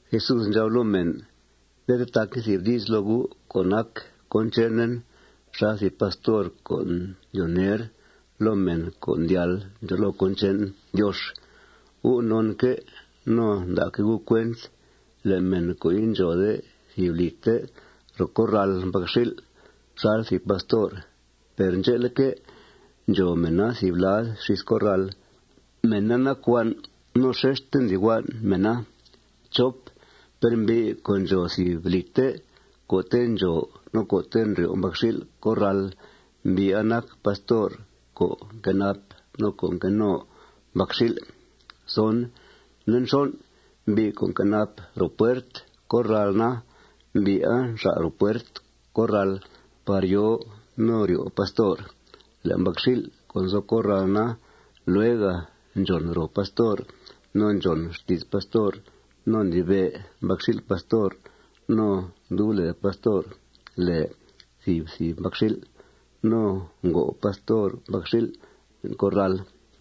Jesús ndxab loo mèn: ―Nde tetaquen thìb di's loo gu' co' nac cón chenen xal thìb pastor co' ndyoo ner loo mèn co' ndyal ndxòo loo cón che'n Diox. Gu' nonque' no nda'que' gu' cuent le' mèn co' indxòode thìb lìte ro corral mbacxil' xal thìb pastor, per ndxe'leque', ndxòo mèna thìb lad xís corral, mèna nac huan' no xexte ndli huan' mèna. Per mbi' co' ndxòo thìb lìte co'te' ndxòo no co'te' ndryo' mbacxil' corral, mbi'a nac pastor co' nquenap no co' nqueno mbacxil'. Nde nxon', mbi' co' nquenap ro puert corral na, mbi'a nxal' ro puert corral par yòo no ryo' pastor. Le' mbacxil' co' nzo corral na, luega ndxòn ro pastor no ndxòn xti's pastor no ndlibe' mbacxil' pastor. No ndub lèe pastor lèe thìb thìb mbacxil'. No ngo' pastor mbacxil' le'n corral.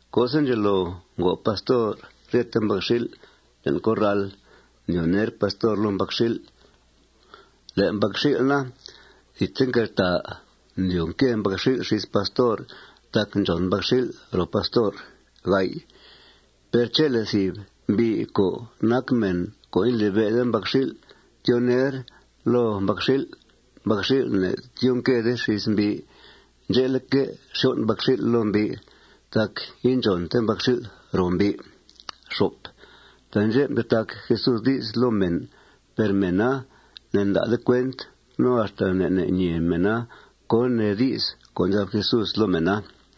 Co'se' ndxelo ngo' pastor ryete mbacxil' le'n corral, ndyoo ner pastor loo mbacxil'. Le' mbacxil' na, thidte nqueltàa. Ndyoo nque mbacxil' xís pastor tac ndxòn mbacxil' ro pastor. Per chele' thìb mbi' co' nac mèn co' indlibe'de mbacxil' tyoo ner loo mbacxil', mbacxil' ne'tyoo nquede xís mbi'. Ndxe'leque', xyon' mbacxil' loo mbi' tac indxònte mbacxil' ro mbi'. Taandxè' mtetac Jesús di's loo mèn. Per mèna ne'nda'de cuent no axta ne' ne' ñee mèna cón nee di's co' ndxab Jesús loo mèna.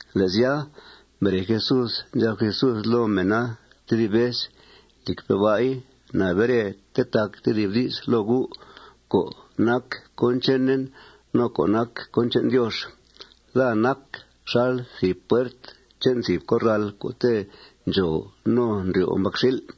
Le' sya, mbere Jesús, ndxab Jesús loo mèna tedib vez: ―Lìcpe' ba'i, na bere tetac tedib di's loo gu' co' nac cón chenen no co' nac cón che'n Diox: Daa nac xal thìb puert che'n thìb corral co'te' ndxòo no ndryo' mbacxil'.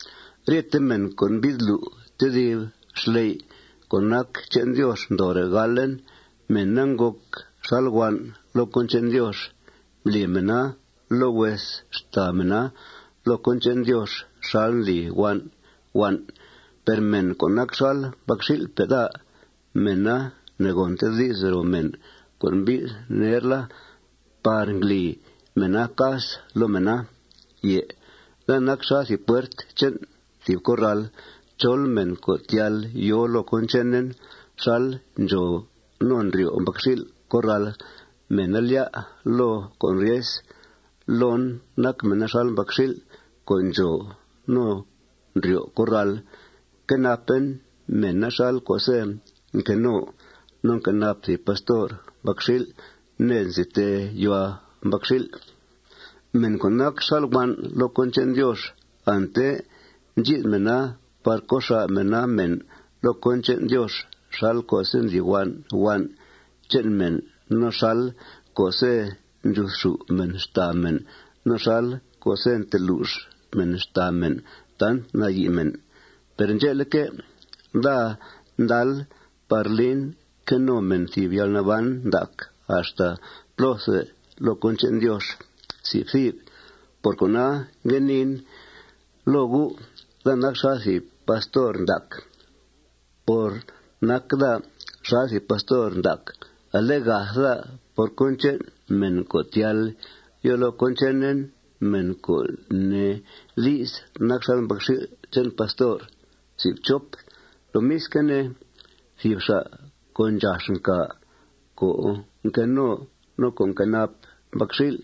Ryete mèn co' mbi'th lu' tedib xley' co' nac che'n Diox ndoore' galen, mèna ngòc xal huan' loo cón che'n Diox. Mbli mèna loo hues xtàa mèna loo cón che'n Diox xal ndli huan' huan'. Per mèn co' nac xal mbacxil'pe' daa, mèna ne'ngònte di's ro mèn co' mbi'th nerla par ngli mèna cas loo mèna. Daa nac xal thìb puert che'n thìb corral. Chol mèn co' ndyal yòo loo cón chenen xal ndxòo no ndryo' mbacxil' corral, mèna lyá' loo con' ryes. Loon nac mèna xal mbacxil' co' ndxòo no ndryo' corral. Quenapen mèna xal co'se' nqueno no nquenap thìb pastor mbacxil' ned nzi tee yuhua mbacxil'. Mèn co' nac xal huan' loo cón che'n Diox, ante ndxi'th mèna par co' xà' mèna mèn loo cón che'n Diox xal co'se' ndli huan' huan' che'n mèn no xal co'se' ndxuthxù' mèn xtàa mèn no xal co'se' ntelux mèn xtàa mèn tant nayi' mèn. Per ndxe'leque', daa ndal par lin que no mèn thìb yalnaban ndac axta plóthe loo cón che'n Diox. Por cona, ngue niin loo gu': Daa nac xal thìb pastor ndac. Por nac daa xal thìb pastor ndac, ale gath daa por cón che'n mèn co' ndyal yòo loo cón chenen, mèn, co' nee di's, nac xal mbacxil' che'n pastor. Lomisque' ne, thìb xa' co' ndxax ncàa co' nqueno no co' nquenap mbacxil',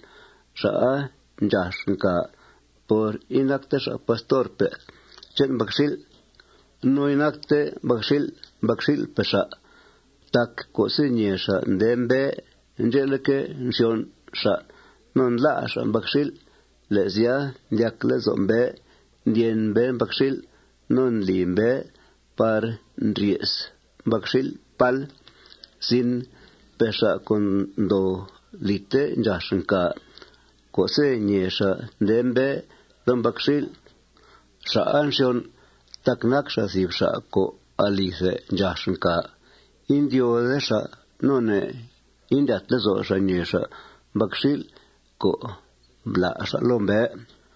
xa'a ndxax ncàa por inacte xa' pastorpe' che'n mbacxil'. No inacte mbacxil' mbacxil'pe' xa'. Tac co'se' ñèe xa' nde mbée, ndxe'leque', nxyon' xa' no ndlá' xa' mbacxil'. Le' sya, ndyac lezo' mbée, ndyen mbée mbacxil'. No ndli mbée par ndrye's mbacxil' pál. Per xa' co' ndoo lìte ndxax ncàa co'se' ñèe xa' nde mbée loo mbacxil', xa'a nxyon' tac nac xa' thìb xa' co' alithe ndxax ncàa. Indyóode xa' no ne' ne' indlyat lezo' xa' ñèe xa' mbacxil' co' mblá' xa' loo mbée.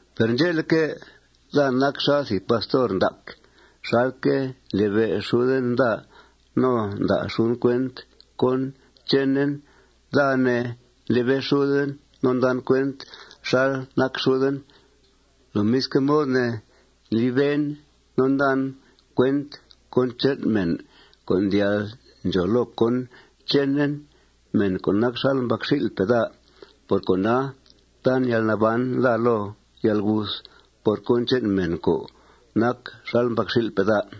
Per ndxe'leque', daa nac xal thìb pastor ndac. Xalque' ndlibe' xuden daa no nda' xuden cuent cón chenen, daa, ne, ndlibe' xuden no ndan cuent xal nac xuden. Lomisque' mod ne, ndliben no ndan cuent cón che'n mèn co' ndyal ndxòo loo cón chenen, mèn co' nac xal mbacxil'pe' daa. Por cona, tan yalnaban daa loo yalguth por cón che'n mèn co' nac xal mbacxil'pe' daa.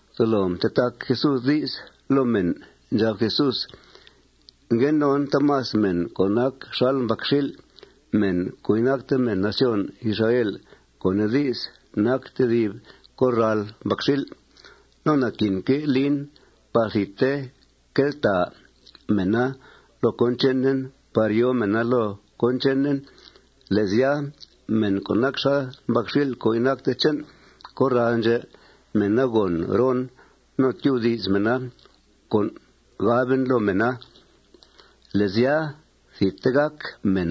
Tolo mtetac Jesús di's loo mèn. Ndxab Jesús: ―Ngue non taamas mèn co' nac xal mbacxil', mèn co' inacte mèn nación Israel, co' nee di's, nac tedib corral mbacxil'. No naquinque' lin par thidte queltàa mèna loo cón chenen par yòo mèna loo cón chenen. Le' sya, mèn co' nac xal mbacxil' co' inacte che'n corral ndxè', mèna gòn ron no tyubdi's mèna con' gaben loo mèna. Le' sya, thidte gàc mèn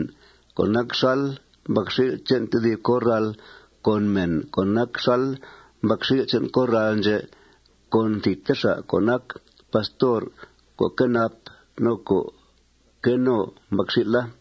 co' nac xal mbacxil' che'n tedib corrala con mèn co' nac xal mbacxil' che'n corral ndxè' con thidte xa' co' nac pastor co' nquenap no co' nqueno mbacxil'a.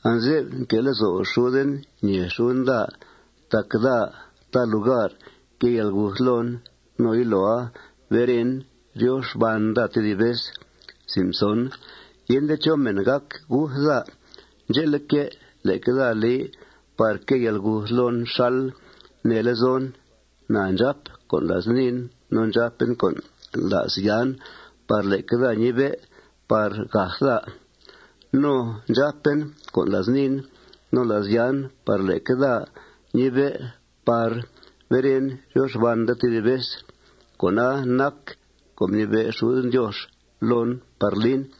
Anze'f nque' lezo' xuden ñèe xuden daa tac daa ta lugar quée yalguth loon. No yiloa beren, ryo xban daa tedib vez. Yende chó mèn gác guth daa. Ndxe'leque', leque daa li par quée yalguth loon xal nee lezon. Na ndxàp con' la's niin no ndxàpen con' la's yan par leque daa ñibe' par gath daa. No ndxàpen con' la's niin no la's yan par leque daa ñibe' par beren, ryo xban daa tedib vez. Con'a nac co' mnibe' xuden Diox loon par lin.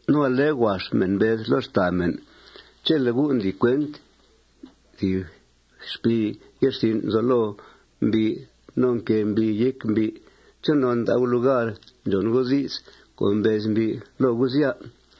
No ale huax mèn mbez loo xtàa mèn: ―Chele' gu' ndli cuent thìb xpii ye'rsin' nzo loo mbi' no nquée mbii yéc mbi', ¿chonon nda' gu' lugar ndxòn gu' di's co' mbez mbi' loo gu', sya?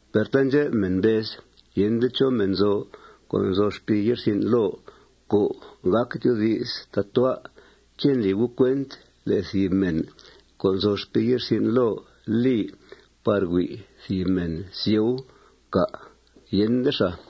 Per taandxep mèn mbez: ―Yende chó mèn nzo co' nzo xpii ye'rsin' loo co' gác tyoodi's tatua'. ¿Ché' ndli gu' cuent le' thìb mèn co' nzo xpii ye'rsin' loo li par hui' thìb mèn sieu, cà'? Yende xàa.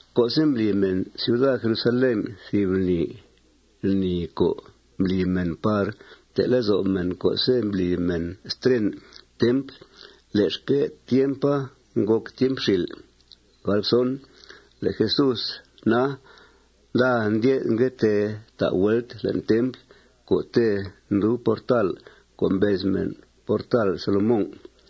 Co'se' mbli mèn ciuda Jerusalén thìb lni, lni co' mbli mèn par mte' lezo' mèn co'se' mbli mèna stren templ, le'xque' tiempa ngòc tiemp xìl'. Le' Jesús na, nda ndye'th, ngue tee ta' vuelt le'n templ co'te' ndub portal co' mbez mèn portal Salomón.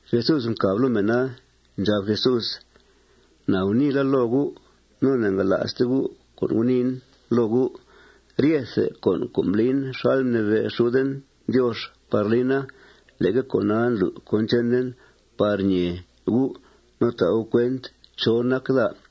Jesús mcàb loo mèna. Ndxab Jesús: ―Na guniila loo gu'. Ne'ngala'ste gu' con' guniin loo gu'. Ryethe con' co' mblin xal mnibe' xuden Diox par lina, leque con'a ndlu' cón chenen par ñee gu' no ta' gu' cuent chó nac daa.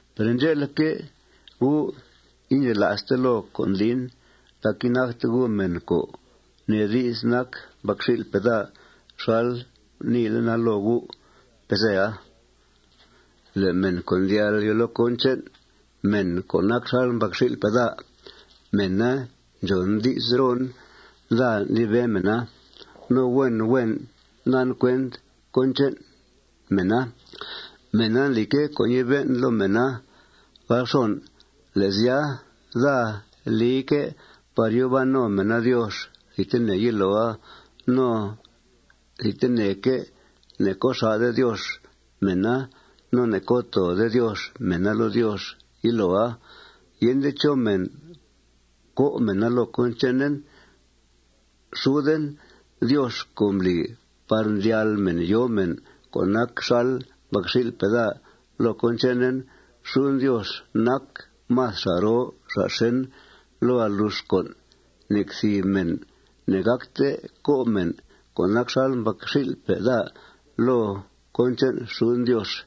Per ndxe'leque', gu' indxela'ste loo con' ndlin tac inacte gu' mèn, co' nee di's, nac mbacxil'pe' daa xal guniilena loo gu' pezea. Le' mèn co' ndyal yòo loo cón che'n mèn co' nac xal mbacxil'pe' daa, mèna ndxòn di's ron. Daa ndlibe mèna. No huen huen ndan cuent cón che'n mèna. Mèna ndlique' co' ñibe'en loo mèna. Le' sya, daa lique' par yòo ban no mèna Diox thidtene yiloa. No thidteneque' ne'co' xà'de Diox mèna no ne'co' toode Diox mèna loo Diox yiloa. Yende chó mèn co' mèna loo cón chenen. Xuden Diox co' mbli par mdyal mèn yòo mèn co' nac xal mbacxil'pe' daa loo cón chenen, xuden Diox nac más xa' roo xa' xèn loo alux con'. Nec thìb mèn ne'gácte co' mèn co' nac xal mbacxil'pe' daa loo cón che'n xuden Diox.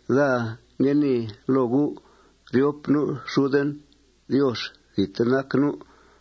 Daa ngue nii loo gu': Ryop nu' xuden Diox thidte nac nu'.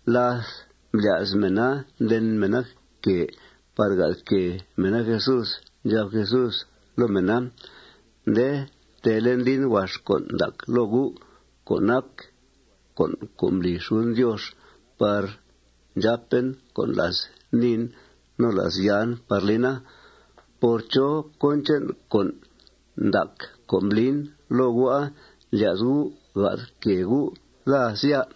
Láth mblya's mèna nden mèna quèe par gath quèe mèna Jesús, ndxab Jesús loo mèna: ―Nde teele' ndlin huax con' ndac loo gu' co' nac con' co' mbli xuden Diox par ndxàpen con' la's niin no la's yan par lina. ¿Por chó cón che'n con' ndac co' mblin loo gu'a ndlya's gu' gath quèe gu' daa, sya?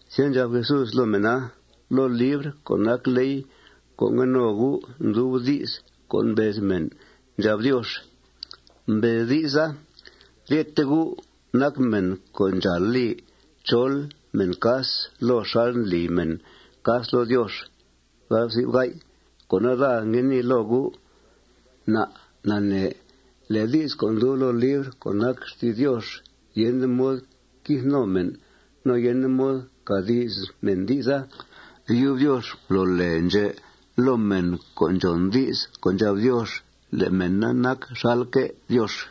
Sya, ndxab Jesús loo mèna: ―Loo libr co' nac ley co' ngue no gu' ndub di's co' mbez mèn ndxab Diox. Mbez di'sa: Ryete gu' nac mèn co' ndxàal li chol mèn cas loo xal li mèn cas loo Diox. Cona, daa ngue nii loo gu': Na' nanee le' di's co' ndub loo libr co' nac xti's Diox yende mod quith no mèn. No yende mod cà di's mèn di'sa. Yub Diox mblo lèe ndxè' loo mèn co' ndxòn di's co' ndxab Diox le' mèna nac xalque' Diox.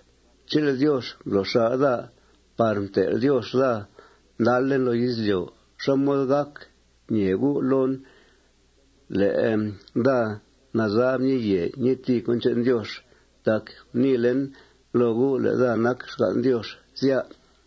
Chele' Diox mblo' xà' daa par mtel' Diox daa ndalen loo izlyo', ¿xá mod gàc ñee gu' loon le' daa nazab ñii yèe ñii tìi cón che'n Diox tac guniilen loo gu' le' daa nac xgan' Diox, sya?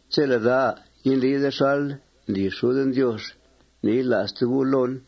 Chele' daa indlide xal ndli xuden Diox, ne'yila'ste gu' loon.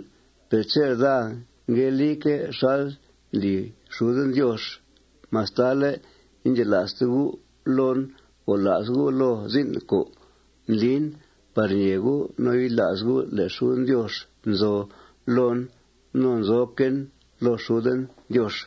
Per chele' daa ngue lique' xal ndli xuden Diox, mastale' indxela'ste gu' loon, gola's gu' loo zin' co' ndlin par ñee gu' no yila's gu' le' xuden Diox nzo loon no nzoquen loo xuden Diox.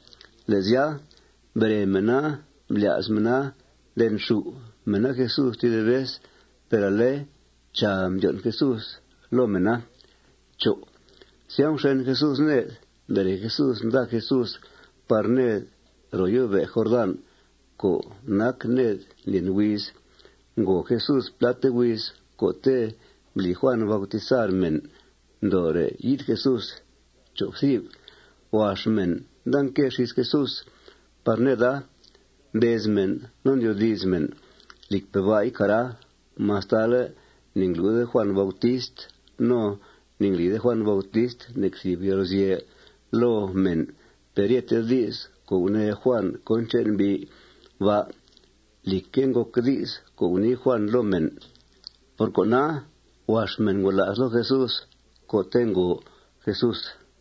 Le' sya, mbere mèna, mblya's mèna ndenxù' mèna Jesús tedib vez. Per ale, chàa, mdyon' Jesús loo mèna. Sya, mxen Jesús ned. Mbere Jesús, nda Jesús par ned ro yó'be' Jordán co' nac ned ndlyen huiz. Ngo Jesús pláte huiz co'te' mbli Juàn bautizar mèn ndoore' yi'th Jesús. Huax mèn nda nque xís Jesús par neda. Mbez mèn no ndyoodi's mèn: ―Lìcpe' ba'i, cara, mastale' ne'nglu'de Juàn Bautist no ne'nglide Juàn Bautist nec thìb yalguzye' loo mèn, per ryete di's co' gunee Juàn cón che'n mbi' ba' lìcque' ngòc di's co' gunii Juàn loo mèn. Por cona, huax mèn ngola's loo Jesús co'te' ngo Jesús.